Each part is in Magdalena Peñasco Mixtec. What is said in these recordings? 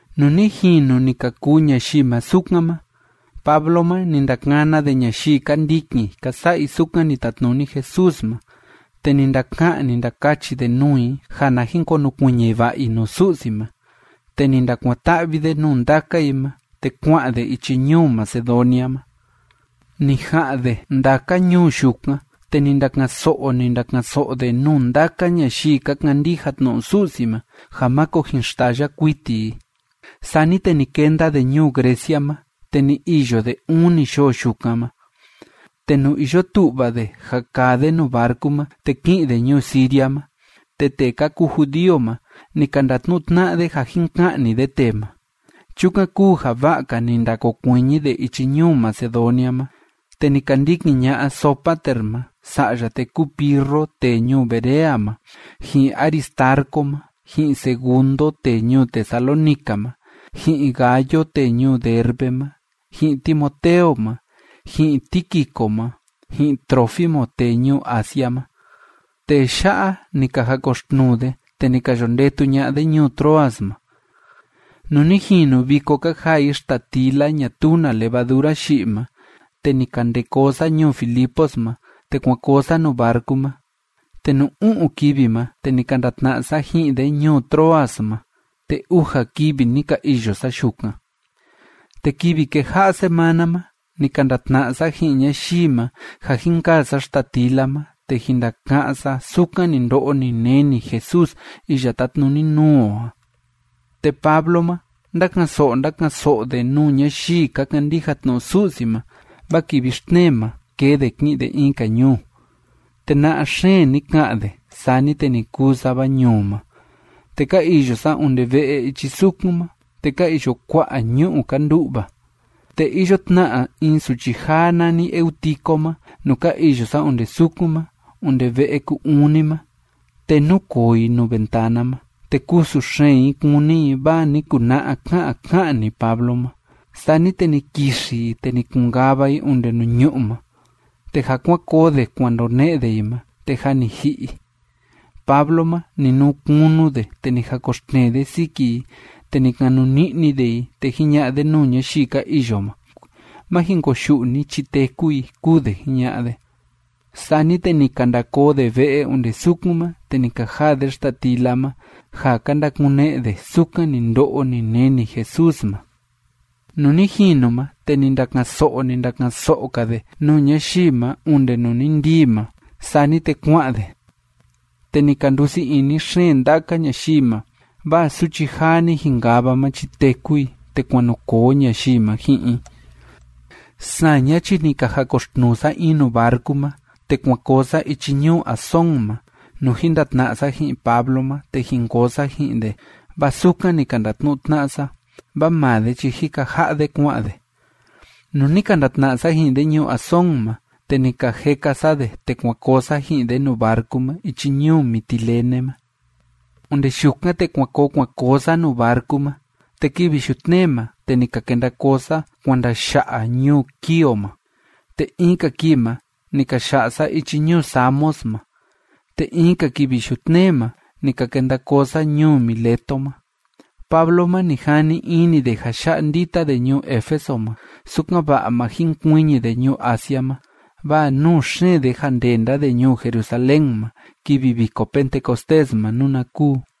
Nuu ni jinu ni ka kuu ñayii ma sukan ma, Pablo ma, ni ndakana de ñayii ka ndikin ka sa'a i sukan ni tatnuni Jesús ma, te ni ndaka'an, ni ndakachi de nuu i ja na jin konukuiñi va'a i nuu Su'si ma, te ni ndakuan‑ta'vi de nuu ndaka i ma, te kua'an de ichi ñuu Macedonia ma. Ni ja'an de ndaka ñuu yukan, te ni ndaka'an‑so'o, ni ndaka'an‑so'o de nuu ndaka ñayii ka kandija tnu'u Su'si ma ja máko jin xtaya kuiti i. Sani te ni kenda de ñuu Grecia ma. Te ni iyo de uni yoo yukan ma. Te nuu iyo tu'va de ja kaa de nuu barcu ma te ki'in de ñuu Siria ma, te tee ka kuu judío ma, ni ka ndatnu'u tna'a de ja jin ka'ni de tee ma. Chukan kúu ja va'a‑ka ni ndakokuiñi de ichi ñuu Macedonia ma. Te ni ka ndikin ña'a Sópater ma sa'ya tee kúu Pirro tee ñuu Berea ma, ji'in Aristarco ma, ji'in Segundo tee ñuu Tesalónica ma, ji'in Gayo tee ñuu Derbe ma, ji'in Timoteo ma, ji'in Tíquico ma, ji'in Trófimo tee ñuu Asia ma. Tee ya'a, ni ka jakoxtnuu de, te ni ka yo ndetu ña'a de ñuu Troas ma. Nuu ni jinu viko ka jaa i xtatila ñatuu na levadura yi'i ma, te ni ka nde koo sa ñuu Filipos ma, te kuan koo sa nuu barcu ma, te nuu u'un kivi ma, te ni ka ndatna'a sa ji'in de ñuu Troas ma, te uja kivi ni ka iyo sa yukan. Te kivi kéja'a smana ma, ni ka ndatna'a sa ji'in ñayii ma, ja jin kaa sa xtatila ma te jin ndaka'án sa sukan ni ndo'o ni neni Jesús iya tátnuni nuu o a. Te Pablo ma, ndáka'an‑so'o, ndáka'an‑so'o de nuu ñayii ka kandija tnu'u Su'si ma, vaa kivi xtnee ma, kee de ki'in de in‑ka ñuu. Te na'a xeen ni ka'an de, sani te ni kuu sava ñuu ma. Te ka iyo sa onde ve'e ichi sukun ma, te ka iyo kua'a ñu'u ka ndu'va. Te iyo tna in suchi jaa nani Eutico ma nuu ka iyo sa onde sukun ma onde ve'e ku‑uni ma, te núkoo i nuu ventana ma, te kusu xeen i kúni i vaa ni kuna'a ká'an ká'an‑ni Pablo ma. Sani te ni kixi i, te ni kun‑kava i onde nuu ñu'ú ma, te ja kuan koo de kuan ndone'e de i ma, te jâ ni ji'i i. Pablo ma, ni nuu kunu de, te ni jakoxtnee de siki i, te ni kanuni'ni de i, te jiña'a de nuu ñayii ka iyo ma: ―Má jin koyu'u ni chi téku i ―kúu de jiña'a de. Sani te ni ka nda koo de ve'e onde sukun ma, te ni ka jaa de xtatila ma, ja ka ndakune'e de sukan ni ndo'o ni neni Jesús ma. Nuu ni jinu ma, te ni ndaka'an‑so'o, ni ndaka'an‑so'o‑ka de nuu ñayii ma onde nuu ni ndii ma. Sani te kua'an de. Te ni ka ndusii ini xeen ndaka ñayii ma, vaa suchi jaa ni jinkava ma chi téku i, te kuan nu koo ñayii ma ji'in i. Saña chi ni ka jakoxtnuu sa in nuu barcu ma, te kuan koo sa ichi ñuu Asón ma, nuu jin ndatna'a sa ji'in Pablo ma te jin koo sa ji'in de, vaa sukan ni ka ndatnu'u tna'a sa, vaa maa de chi jika ja'a de kua'an de. Nuu ni ka ndatna'a sa ji'in de ñuu Asón ma, te ni ka jeka sa de, te kuan koo sa ji'in de nuu barcu ma ichi ñuu Mitilene ma. Onde yukan, te kuan koo kuan koo sa nuu barcu ma, te kivi yutnee ma, te ni ka kenda koo sa kuan ndaya'a ñuu Quío ma. Te in‑ka kii ma, ni ka ya'a sa ichi ñuu Samos ma, te in‑ka kivi yutnee ma, ni ka kenda koo sa ñuu Mileto ma. Pablo ma, ni jani ini de ja ya'a ndita de ñuu Éfeso ma, sukan‑va'a ma jinkuiñi de ñuu Asia ma, vaa nuu xeen de ja ndenda de ñuu Jerusalén ma kivi Viko Pentecostés ma, nuna kuu.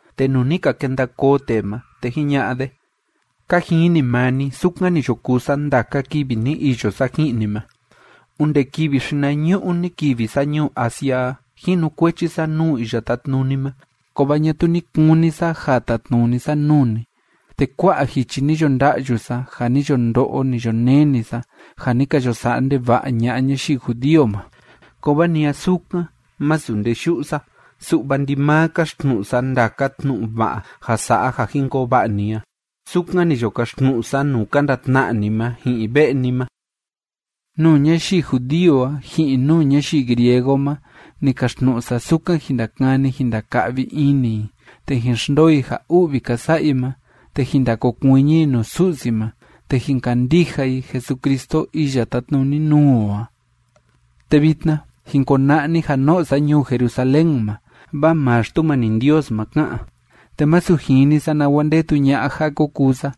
Te nuu ni ka kenda koo tee ma, te jiña'a de: ―Ka jini maa ni sukan ni yo kuu sa ndaka kivi ni iyo sa ji'in ni ma, onde kivi xinañu'u ni kivi sa ñuu Asia a. Jinukuechi sa nuu Iya Tátnuni ma, kovaa ñatuu ni kuni sa ja tatnuni sa nuu ni, te kua'a jichi ni yo nda'yu sa, ja ni yo ndo'o, ni yo neni sa, ja ni ka yo sa'a ndeva'a ña'a ñayii judío ma. Kovaa ni a sukan, masu nde yu'u sa, su'va ndimaa káxtnu'u sa ndaka tnu'u va'a ja sa'a ja jin koo va'a ni a. Sukan ni yo kaxtnu'u sa nuu ka ndatna'a ni ma ji'in ve'e ni ma. Nuu ñayii judío a ji'in nuu ñayii griego ma ni kaxtnu'u sa sukan jin ndakani jin ndaka'vi ini i te jin xndoo i ja u'vi ka sa'a i ma te jin ndakokuiñi i nuu Su'si ma te jin kandija i Jesucristo iya tátnuni nuu o a. ’Te vitna jin kona'a ni ja no'o sa ñuu Jerusalén ma, vaa maa Xtumani Ndios ma ká'an, te masu jini sa nawa ndetu ña'a ja ko kuu sa.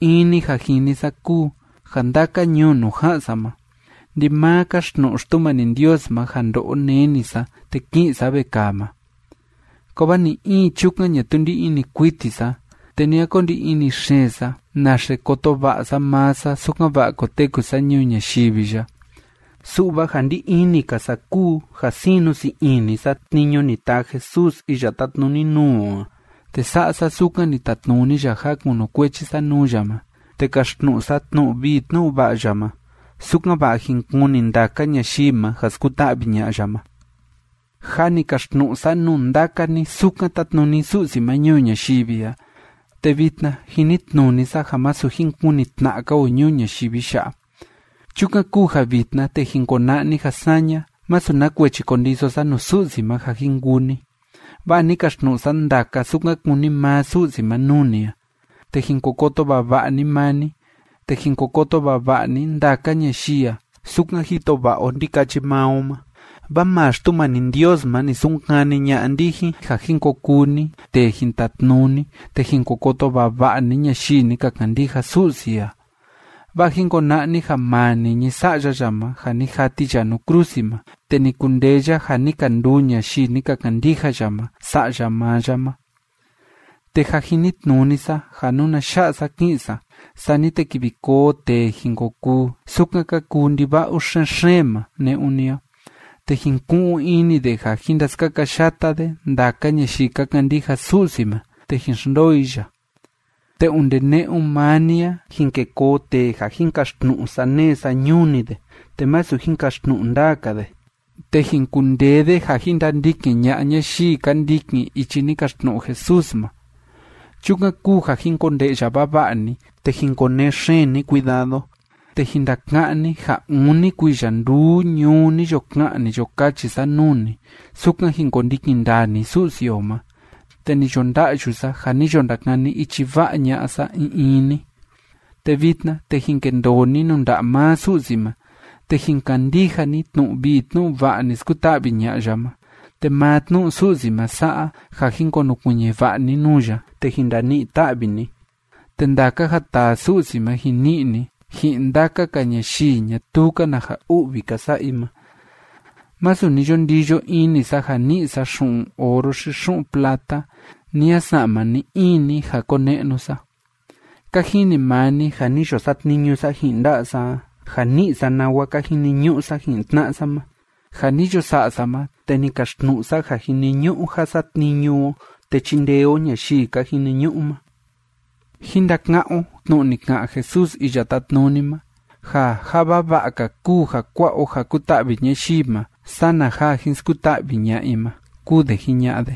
In‑ni ja jini sa kúu ja ndaka ñuu nuu ja'an sa ma, ndimaa káxtnu'u Xtumani Ndios ma ja ndo'o neni sa te ki'in sa vekaa ma. Kovaa ni‑in chukan ñatuu ndí ini kuiti sa, te ni a ko ndi ini xeen sa naxe koto va'a sa maa sa sukan‑va'a koteku sa ñuu ñayivi ya, su'va ja ndí ini‑ka sa kúu ja sinu sii ini sa tniñu ni taa Jesús iya tátnuni nuu o a, te sa'a sa sukan ni tatnuni ya ja kunukuechi sa nuu ya ma, te kaxtnu'u sa tnu'u vii tnu'u va'a ya ma sukan‑va'a jin kuni ndaka ñayii ma ja skuta'vi ña'a ya ma. ’Jâ ni kaxtnu'u sa nuu ndaka ni sukan tátnuni Su'si ma ñuu ñayivi a, te vitna jinitnuni sa ja masu jin kuni tna'a‑ka o ñuu ñayivi ya'a. Chukan kúu ja vitna, te jin kona'a ni ja saña, masu na kuechi kondiso sa nuu Su'si ma ja jin kuu ni, vaa ni kaxtnu'u sa ndaka sukan kúni maa Su'si ma nuu ni a. Te jin ko koto vava'a ni maa ni, te jin ko koto vava'a ni ndaka ñayii a sukan jito va'a o ndikachi maa o ma, vaa maa Xtumani Ndios ma ni sunkani ña'a ndijin ja jin ko kuu ni tee jin tatnuni te jin ko koto vava'a ni ñayii ni ka kandija Su'si a. Vaa jin kona'a ni ja maa niñi Sa'ya ya ma ja ni jati ya nuu krusi ma, te ni kundee ya ja ni ka nduu ñayii ni ka kandija ya ma sa'ya maa ya ma. Te jâ jinitnuni sa ja nuna ya'a sa ki'in sa, sani te kivi koo tee jin ko kuu sukan ka kuu ndiva'u xen‑xeen ma ne'un ni a, te jin ku'un ini de ja jin ndaskakayata de ndaka ñayii ka kandija Su'si ma te jin xndoo i ya. Te onde ne'un maa ni a, jin ke koo tee ja jin kaxtnu'u saneé sañuu‑ni de, te masu jin kaxtnu'u ndaa‑ka de, te jin kundee de ja jin ndandikin ña'a ñayii ka ndikin ichi ni kaxtnu'u Jesús ma. Chukan kúu ja jin konde'ya vava'a ni te jin konee xeen ni cuidado, te jin ndaka'án ni ja uni kuiya nduu ñuu ni yo ka'an, ni yo kachi sa nuu ni sukan jin kondikin ndaa ni Su'si o ma, te ni yo nda'yu sa ja ni yo ndakani ichi va'a ña'a sa in in ni. ’Te vitna, te jin kendoo ni nuu nda'a maa Su'si ma, te jin kandija ni tnu'u vii tnu'u va'a ni skuta'vi ña'a ya ma, te maa tnu'u Su'si ma sa'a ja jin konukuiñi va'a ni nuu ya, te jin ndani'i ta'vi ni, te ndaka ja taa Su'si ma jin ni'i ni ji'in ndaka‑ka ñayii ñatuu‑ka na ja u'vi ka sa'a i ma. Masu ni yo ndiyo ini sa ja ni'i sa xu'un oro xi xu'un plata, ni a sa'ma ni‑in ni ja kone'nu sa. Ka jini maa ni ja ni yo satniñu sa ji'in nda'a sa a ja ni'i sa nawa ka jiniñu'u sa ji'in tna'a sa ma. Ja ni yo sa'a sa ma, te ni kaxtnu'u sa ja jiniñu'u ja satniñu o te chindee o ñayii ka jiniñu'u ma. Jín ndaka'án o tnu'u ni ka'an Jesús Iya Tátnuni ma, ja ja vava'a‑ka kúu ja kua'a o ja kuta'vi ñayii ma sana ja jin skuta'vi ña'a i ma ―kúu de jiña'a de.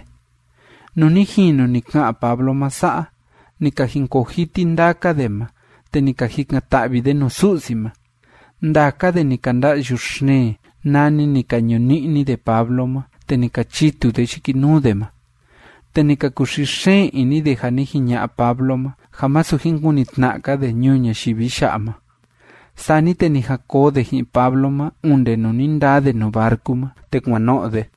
Nuu ni jinu ni ka'an Pablo ma sa'a, ni ka jinkoo jiti ndaka de ma, te ni ka jikan‑ta'vi de nuu Su'si ma. Ndaka de ni ka nda'yu xeen, nani ni ka ñuni'ni de Pablo ma, te ni ka chitu de yikinuu de ma. Te ni ka kuxii xeen ini de, ja ni jiña'a Pablo ma ja masu jin kuni tna'a‑ka de ñuu ñayivi ya'a ma. Sani te ni jan koo de ji'in Pablo ma onde nuu ni ndaa de nuu barcu ma te kuan no'o de.